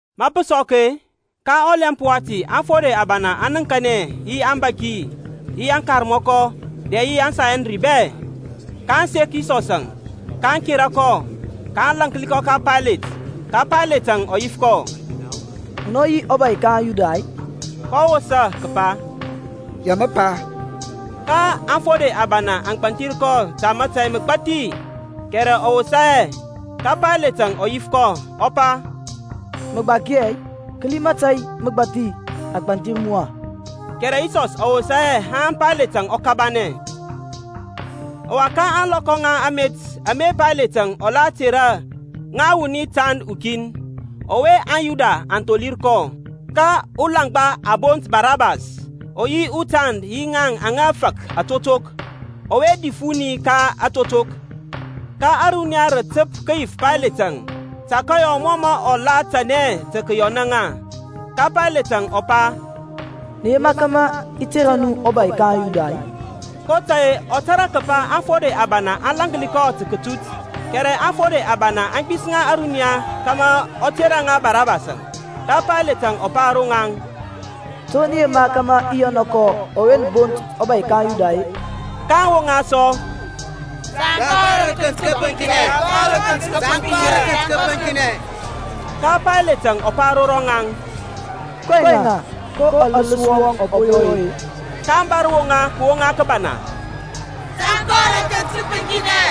Ma pə sɔk-e, ka ɔlɛmp wati aŋfode abana aŋ nəŋkanɛ yi aŋbȧki yi aŋkarmɔkɔ dɛ yi aŋSanhedrin bɛ, kaŋ sek Yisɔsȧŋ, aŋ kera kɔ, kaŋ lȧnki kɔ ka Paylet. Ka Payletȧŋ ɔ yif kɔ, Munɔ yi ɔbȧy ka aŋYuda-i? kɔ wosa kəpa, Ya mə pa. Ka aŋfode abana aŋ gbanthir kɔ ta mȧtȧy məgbathi, kɛrɛ ɔ wosa hɛ. Ka Paylet ɔ yif kɔ sɔ, ɔ pa, Mə gbaki hɛ-i? Kəli mȧtȧy məgbathi a gbanthir mu-a. Kɛrɛ Yisɔs ɔ wosa hɛ haŋ Paylet ɔ kabanɛ. Ɔwa ka ȧŋlɔkɔ ŋa amet ame Payletȧŋ ɔ la tera ŋa wuni utand ukin, ɔwe aŋYuda aŋ tholir kɔ. Ka ulaŋgba a bont Barabas ɔ yi utand yi ŋaŋ aŋa fak atotok, ɔwe dif wuni ka aŋtotok. Ka ȧruniya rə təp kəyif Paylet tə kəyɔ mɔ mɔ la tanɛ tə kəyɔnȧ ŋaŋ. Ka Payletȧŋ ɔ pa, Nə yema kȧmȧ i tera nu ɔbȧy ka aŋYuda-i? kotȧy-e ɔ tȧrȧ kəpa aŋfode abana aŋ lȧnki kɔ ta kətut. Kɛrɛ aŋfode abana aŋ gbisəŋa ȧruniya kȧmȧ ɔ tera ŋa Barabasȧŋ. Ka Paylet ɔ pa ro ŋaŋ, To nə yema kȧmȧ i yɔna kɔ ɔwe nə bont ɔbȧy ka aŋYuda-e? kaŋ woŋa sɔ, Tȧŋ kɔ rə akənt kəpəŋkinɛ. Ka Payletȧŋ ɔ pa ro rɔŋaŋ, Kɔɛŋ-a? Ko ɔləs wɔŋ ɔ po yɔ-e? kaŋ bȧr woŋa kəwoŋa kəbana, Tȧŋ kɔ rə akənt kəpəŋkinɛ.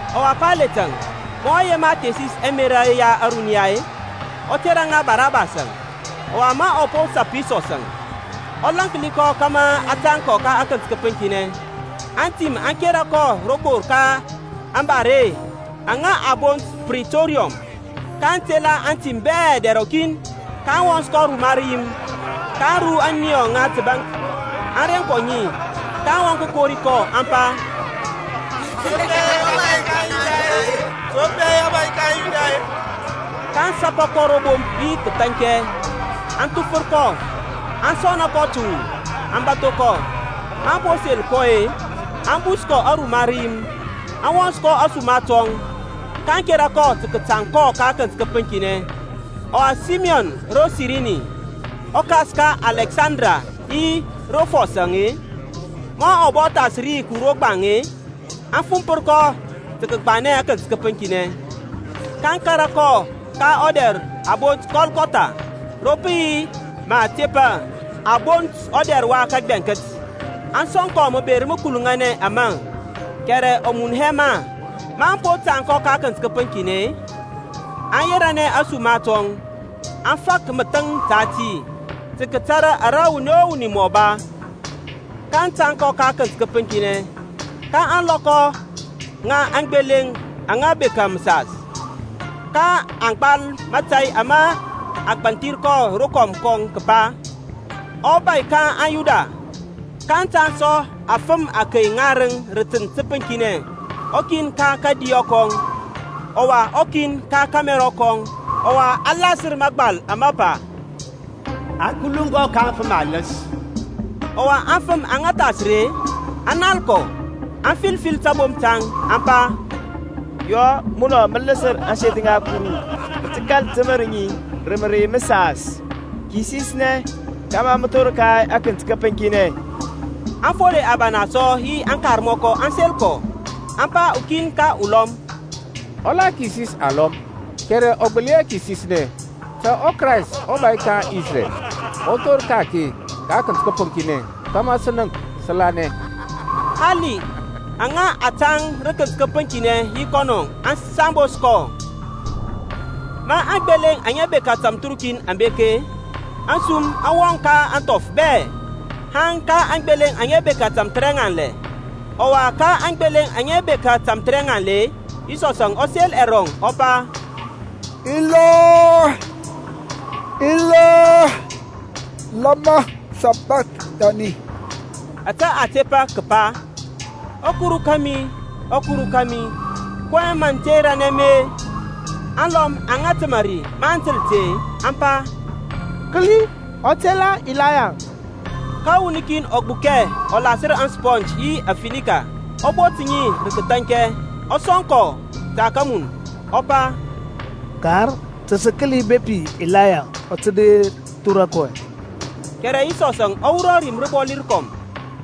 Ɔwa Payletȧŋ, ma ɔ yema thesis ɛmerȧ ya ȧruniya-e, ɔ tera ŋa Barabas, ɔwa ma ɔ po sap Yisɔsȧŋ, ɔ lȧnki kɔ kȧmȧ a tȧŋ kɔ ka akənt kəpəŋkinɛ. Antim aŋ kera kɔ rokor ka ȧŋbare aŋa a bont Pritoriɔm, kaŋ tela aŋtim bɛ dɛr rɔkin. kaŋ wɔns kɔ ruma rəyim, kaŋ ru ȧniyɔ ŋa təbaŋk, aŋ reŋ kɔ ŋi. kaŋ wɔŋ kəkori kɔ aŋ pa, To pɛ, ɔbȧy ka aŋYuda-e? kaŋ sapa kɔ ro bomp yi kəthaŋkɛ, aŋ thufər kɔ, aŋ sɔna kɔ təwu, aŋ bȧtho kɔ. Maŋ po sel kɔ-e, aŋ bus kɔ aruma rəyim, aŋ wɔns kɔ ȧsuma tɔŋ, kaŋ kera kɔ tə kətaŋ kɔ ka akənt kəpəŋkinɛ. Ɔwa Saymɔn ro Sirini, ɔkas ka Alɛksanda yi Rufɔs-e, ma ɔ bɔ thas ri kəwur ro gbaŋ-e, aŋ fumpər kɔ tə kəgbanɛ akənt kəpəŋkinɛ. kaŋ kȧrȧ kɔ ka ɔdɛr a bont Kɔlkɔtha, ro pə yi ma a tepa, a bont ɔdɛr wa kəgbɛŋkət. Aŋ sɔŋ kɔ məber məkuluŋanɛ ȧŋma, kɛrɛ ɔ mun hɛ ma. Maŋ po tȧŋ kɔ ka akənt kəpəŋkinɛ-e, aŋ yeranɛ ȧsuma tɔŋ, aŋ fak məthəŋ ta ti, tə kətara ara wuni o wuni mɔ ba. Ka a tȧŋ kɔ ka akənt kəpəŋkinɛ ka ȧŋlɔkɔ ŋa aŋgbeleŋ aŋa bekȧ məsas. Ka a gbal mȧtȧy ama a gbanthir kɔ rokɔm kɔŋ kəpa, ƆBȦY KA AŊYUDA. kaŋ tȧŋ sɔ afəm akey ŋarəŋ rə tənt təpəŋkinɛ; ukin ka kȧdiyɔ kɔŋ, ɔwa ukin ka kȧmɛrɔ kɔŋ. Ɔwa a lasər mȧgbal ama pa, A kuluŋ kɔ ka aŋfəm aləs. Ɔwa aŋfəm aŋa thas ri-e, aŋ nal kɔ, aŋ fil fil tabomp taŋ, aŋ pa, Yɔ! Munɔ mə ləsər ȧŋseth ŋa Kuru, mə kȧl təmər ŋi rə mərey məsas, kisisnɛ kȧmȧ mə thor ka akənt kəpəŋkinɛ. Aŋfode abana sɔ yi aŋkarmɔkɔ aŋ sel kɔ, aŋ pa ukin ka ulɔm, Ɔ la kisis alɔm, kɛrɛ ɔ gbəli hɛ kisisnɛ. Ta ɔKrayst ɔbȧy ka aŋIsrɛl ɔ thor ka-ake ka akənt kəpəŋkinɛ kȧmȧ sə nənk, sə lanɛ. Hali aŋa a tȧŋ yi kɔnɔ rə tənt təpəŋkinɛ aŋ sambos kɔ. Ma aŋgbeleŋ aŋa bekȧ tamthərukin aŋ bek-e, asum aŋ wɔŋ ka ȧŋthɔf bɛ, haŋ ka aŋgbeleŋ aŋa bekȧ tȧmthərɛŋanlɛ. Ɔwa ka aŋgbeleŋ aŋa bekȧ tamthərɛŋanlɛ-e, Yisɔsȧŋ ɔ sel ɛrɔŋ lɛɔ, ɔ pa, Ilɔi, Ilɔi, lama Sabakthani? Ȧtȧ a tepa kəpa, ƆKuru kȧmi, ɔKuru kȧmi, kɔyɛŋ mə ter mi-e? Aŋlɔm aŋa təmȧ ri maŋ təl ti-e, aŋ pa, Kəli, ɔ tela Ilaya. Ka wuni kin ɔ gbukɛ ɔ lasər asponge yi afinika, ɔ bot ŋi rə kəthaŋkɛ, ɔ sɔŋ kɔ tə kəmun, ɔ pa, Kar, ta sə kəli bepi Ilayaŋ ɔ tə der thora kɔ. Kɛrɛ Yisɔsȧŋ ɔ wurɔ rim rəbɔli rəkɔm,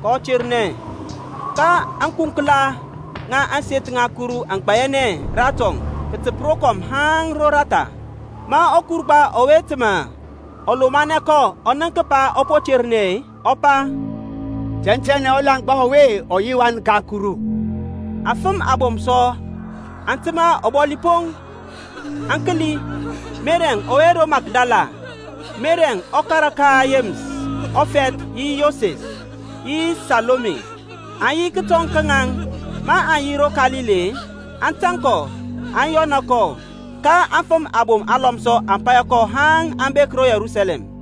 kɔ ternɛ. Ka ȧŋkunklanɛ ŋa ȧŋseth ŋa Kuru aŋ gbayanɛ ratɔŋ kətəp rokɔm haŋ roratha. Ma ɔkurgba ɔwe təmȧ ɔ lomanɛ kɔ ɔ nənk kəpa ɔ po ternɛ-e, ɔ pa, Tɛntɛnɛ ɔlaŋgba ɔwe ɔ yi ɔWan ka Kuru. Afəm abom sɔ aŋ təmȧ ɔbɔli poŋ, aŋ kəli; Meri ɔwe ro Makdala, Meri ɔkara ka Yeməs ɔfɛth yi Yoses, yi Salome, aŋ yi kətɔŋ ka ŋaŋ; maŋ yi ro Kalili-e, aŋ tȧŋ kɔ aŋ yɔna kɔ. Ka afəm abom alɔm sɔ aŋ paya kɔ haŋ aŋ bek ro Yerusalɛm.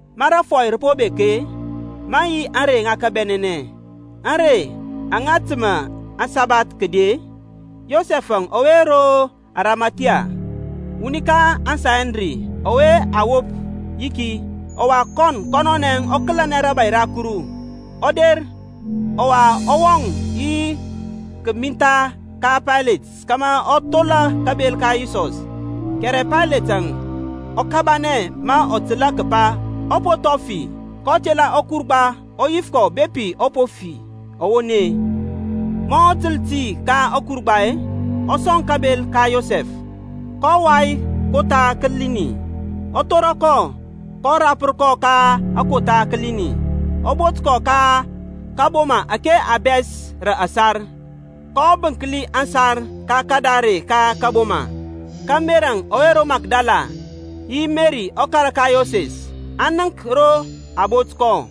Ma rȧfɔy rə po bek-e, maŋ yi ȧŋrey ŋa kabɛnɛnɛ, ȧŋrey aŋa təmȧ aŋsabath kədi-e, Yosɛf ɔwe ro Arimathia, wuni ka aŋSanhedrin ɔwe a wop yiki, ɔwa kɔn kɔnɔnɛ ɔ kəlɛnɛ rȧbȧy ra Kuru, ɔ der, ɔwa ɔ wɔŋ yi kəmintha ka Paylet kȧmȧ ɔ thola kabel ka Yisɔs. Kɛrɛ Payletȧŋ ɔ kabanɛ ma ɔ təl kəpa ɔ po thɔŋ fi. Kɔ tela ɔkurgba ɔ yif kɔ bepi ɔ po fi ɔwoni. Ma ɔ təl ti ka ɔkurgba-e, ɔ sɔŋ kabel ka Yosɛf. kɔ wai kotha kəlinɛn, ɔ thora kɔ, kɔ rapər kɔ ka akotha kəlinɛn, ɔ bot kɔ ka kəboma ȧke a bɛs rə ȧsar, kɔ bənkli ȧsar ka kadare ka kȧboma. Ka Meri ɔwe ro Makdala yi Meri ɔkara ka Yoses aŋ nənk ro a bot kɔ.